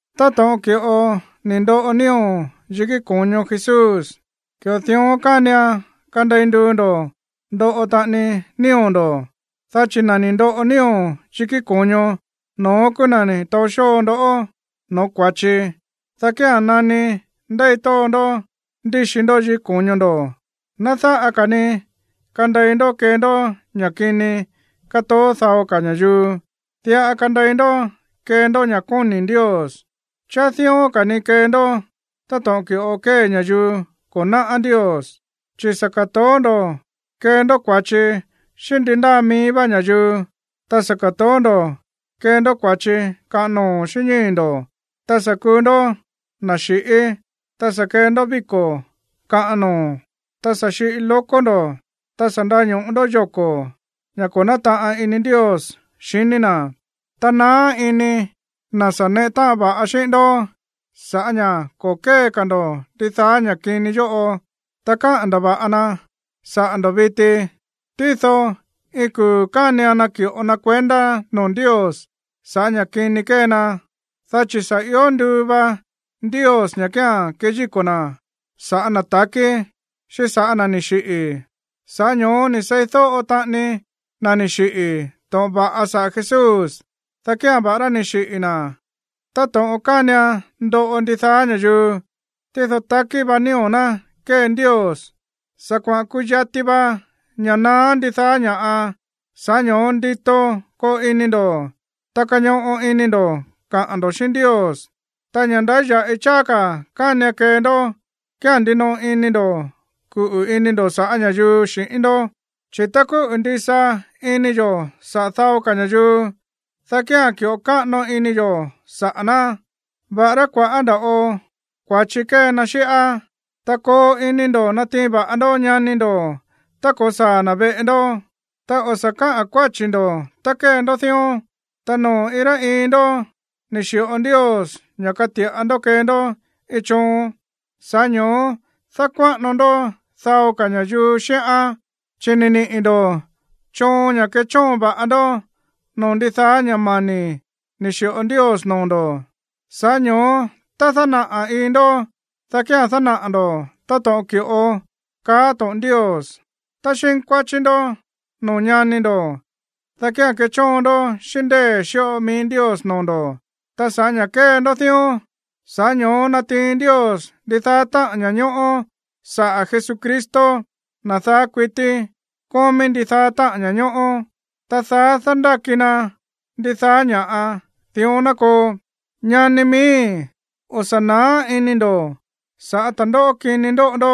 Táto̱ꞌon ki̱ꞌo ni̱ ndoꞌo nío̱ yikí ko̱ño Jesús, ki̱ꞌo dión kánian kandei nduu ndo̱ ndoꞌo taꞌani nío̱ ndo̱, dá chi̱ na̱ ni̱ ndoꞌo nío̱ yikí ko̱ño, no̱ón kúú na̱ ni̱ taó xóo ndó no̱ó kua̱chi, dá kía̱n nani ndéi tóo ndó ndíxi ndó yikí ko̱ño ndo̱, ná dáꞌa ka̱ ni kandei ndó kee ndó ña̱ kini kátoó dao ka̱ ña̱yuu. Diꞌa kandei ndó kee ndó ña̱ kóni̱ Ndios. Cháá dión ka̱ ni̱ kee ndó táto̱ꞌon ki̱ꞌo kée ña̱yuu ko̱ náꞌá Ndios, chi̱ sa̱ ka̱toó ndo̱ kee ndó kua̱chi xíꞌín ndi ndáa mií vá ña̱yuu, ta sa̱ ka̱toó ndo̱ kee ndó kua̱chi kaꞌan noo̱ xíꞌín ñíi̱ ndo̱, ta sa̱ kuu ndó na̱ xi̱ꞌí, ta sa̱ kee ndó víko̱ kaꞌan noo̱, ta sa̱ xiꞌi lóko̱ ndo̱, ta sa̱ ndaño̱ꞌo ndó yoko̱, ña̱ ko̱ nátaꞌan ini Ndios xiní na̱. Ta naá ini na̱ sa̱ neꞌe táꞌan va̱ꞌa xíꞌín ndó sa̱ꞌá ña̱ ko̱ kée ka̱ ndo̱ ndidaá ña̱ kini yóꞌo, ta káꞌa̱n ndava̱ꞌa na saꞌa̱ ndo̱ viti. Tído iin kuu̱ kánian naki̱ꞌo na kuendá noo̱ Ndios sa̱ꞌá ña̱ kini kée na, dá chi̱ sa̱ io nduu va Ndios ña̱ kía̱n keyíko̱ na̱ sa̱ꞌá na̱ ta̱kí, xíꞌín sa̱ꞌá na̱ ni̱ xiꞌi̱. Sa̱ꞌá ño̱ó ni̱ seídóꞌo taꞌani na̱ ni̱ xiꞌi̱ to̱ꞌon va̱ꞌa saꞌa̱ Jesús, dá kía̱n, va̱ꞌará ni̱ xiꞌi̱ na̱ táto̱ꞌon kánian ndoꞌo ndidaá ña̱yuu, tído takí va nío̱ ná kée Ndios. Sa̱ kuaꞌa̱n kuyati va ña̱ naá ndidaá ña̱ꞌa. Sa̱ꞌá ño̱ó ndito koo ini ndo̱, ta kañoꞌo ini ndo̱ kaꞌa̱n ndo̱ xíꞌín Ndios. Ta ña̱ ndáya̱ꞌi cháá ka̱ kánian kee ndó kía̱n ndinoꞌo ini ndo̱ kuꞌu̱ ini ndo̱ sa̱ꞌá ña̱yuu xi̱ꞌín ndó, chi̱ tá kúꞌu̱ ndisa ini yo̱ saꞌa̱ dao ka̱ ña̱yuu, dá kía̱n ki̱ꞌo káꞌano ini yo̱ saꞌa̱ ná, va̱ꞌará kua̱ꞌá nda̱ꞌo kua̱chi kée na xíꞌá. Ta koo ini ndo̱ natiin va̱ꞌa ndó ñani ndo̱ tá ko̱saa̱ na̱ veꞌe ndó, ta o̱ sa̱ káꞌa̱n kuáchi̱ ndo̱ tá kée ndó dión. Ta noo̱ iin rá iin ndó ni̱ xi̱ꞌo Ndios ña̱ kati̱ꞌa ndó kee ndó iin choon, sa̱ꞌá ño̱ó dákuáꞌano ndó dao ka̱ ña̱yuu xíꞌán. Chi̱ ni̱ niꞌi̱ ndo̱ choon ña̱ kechóon va̱ꞌa ndó noo̱ ndidaá ña̱ mani̱ ni̱ xi̱ꞌo Ndios noo̱ ndo̱. Sa̱ꞌá ño̱ó tá dánaꞌa̱ iin ndó, dá kía̱n dánaꞌa̱ ndo̱ táto̱ꞌon ki̱ꞌo káꞌa̱n to̱ꞌon Ndios. Tá xínkuáchí ndó noo̱ ñani ndo̱, dá kía̱n kechóon ndó xíꞌín ndée̱ xíꞌo mií Ndios noo̱ ndo̱. Ta sa̱ꞌá ña̱ kée ndó dión, sa̱ꞌá ño̱ó natiin Ndios ndidaá táꞌa̱n ña̱ñóꞌó saꞌa̱ Jesucristo, na̱ daá kuití kómí ndidaá táꞌa̱n ña̱ñóꞌó, ta daá dándáki na ndidaá ña̱ꞌa. Dión ná koo. Ñani mani̱, o̱ sa̱ na̱á ini ndo̱ sa̱ꞌá ta̱ndóꞌó kini ndóꞌo ndó,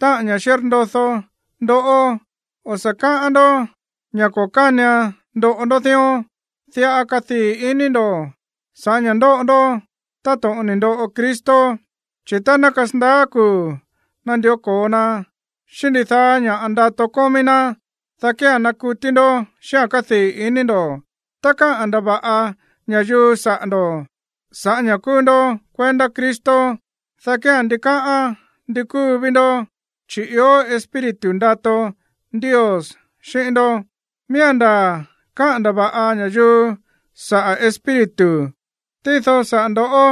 táꞌa̱n ña̱ xírndodó ndoꞌó. O̱ sa̱ káꞌán ndó ña̱ ko̱ kánian ndoꞌo ndó dión. Diꞌa kadii̱ ini ndo̱ sa̱ꞌá ña̱ ndóꞌo ndó táto̱ꞌon ni̱ ndoꞌo Cristo. Chi̱ tá ná kasandaá kuu̱ nandió ko̱o na xíꞌín ndidaá ña̱ ndato kómí ná, dá kía̱n nakutí ndó xíꞌa̱n kádii̱ iní ndo̱. Tá káꞌa̱n ndava̱ꞌa ña̱yuu saꞌa̱ ndo̱ sa̱ꞌá ña̱ kúú ndó kuendá Cristo, dá kía̱n ndikáꞌán ndi kúu ví ndó, chi̱ ió Espíritu ndato Ndios xíꞌín ndó. Miía̱n ndaa̱ káꞌa̱n ndava̱ꞌa ña̱yuu saꞌa̱ Espíritu, tído saꞌa̱ ndo̱ꞌó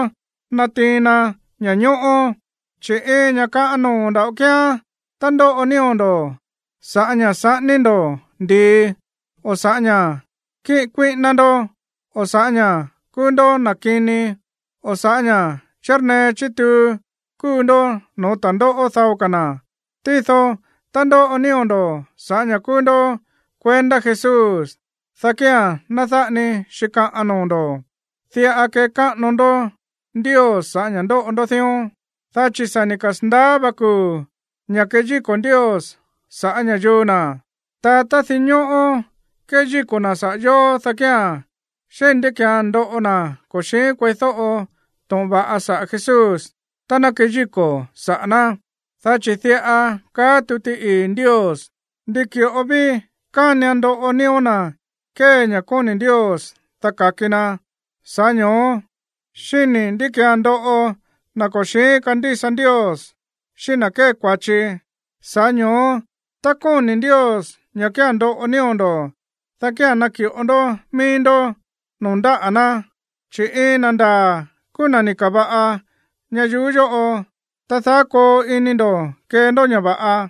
natiin na ña̱ñóꞌó. Chi̱ iin ña̱ kaꞌan noo̱ nda̱ꞌo kíán tá ndóꞌo nío̱ ndo̱ sa̱ꞌá ña̱ saꞌání ndo̱ ndi̱i, o sa̱ꞌá ña̱ kíꞌin kuíꞌíná ndó, o sa̱ꞌá ña̱ kúú ndó na̱ kini, o sa̱ꞌá ña̱ chírnee chítuu kúu ndó no̱ó ta̱ndóꞌó dao ka̱ na̱. Tído tá ndóꞌo nío̱ ndo̱ sa̱ꞌá ña̱ kúú ndó kuendá Jesús, dá kía̱n ná dáꞌa ni xíkaꞌan noo̱ ndo̱. Diꞌa kekáꞌano ndó Ndios sa̱ꞌá ña̱ ndóꞌo ndó dión. Dá chi̱ sa̱ ni̱ kasa̱ndaá va kuu̱ ña̱ keyíko̱ Ndios sa̱ꞌá ña̱yuu na̱. Ta tá dinñóꞌó keyíko̱ na̱ saꞌa̱ yóó, dá kía̱n, ¿xíni̱ ndí ki̱án ndoꞌo na̱ ko̱ xi̱ín kueídóꞌo to̱ꞌon va̱ꞌa saꞌa̱ Jesús tá ná keyíko̱ saꞌa̱ ná? Dá chi̱ diꞌa kaá tuti ii̱ Ndios: Ndi ki̱ꞌo ví kánian ndoꞌo nío̱ na̱ kée ña̱ kóni̱ Ndios, dá ka̱ki na. Sa̱ꞌá ño̱ó, ¿xíni̱ ndí ki̱án ndoꞌo na̱ ko̱ xi̱ín kandísa Ndios, xíꞌín na̱ kée kua̱chi? Sa̱ꞌá ño̱ó tá kóni̱ Ndios ña̱ kía̱n ndoꞌo nío̱ ndo̱, dá kía̱n naki̱ꞌo ndó mií ndó noo̱ ndáꞌa̱ ná, chi̱ iin na̱ ndaa̱ kúú na̱ ni̱ ka̱va̱ꞌa ñayuú yóꞌo. Ta daá koo ini ndo̱ kee ndó ña̱ va̱ꞌa.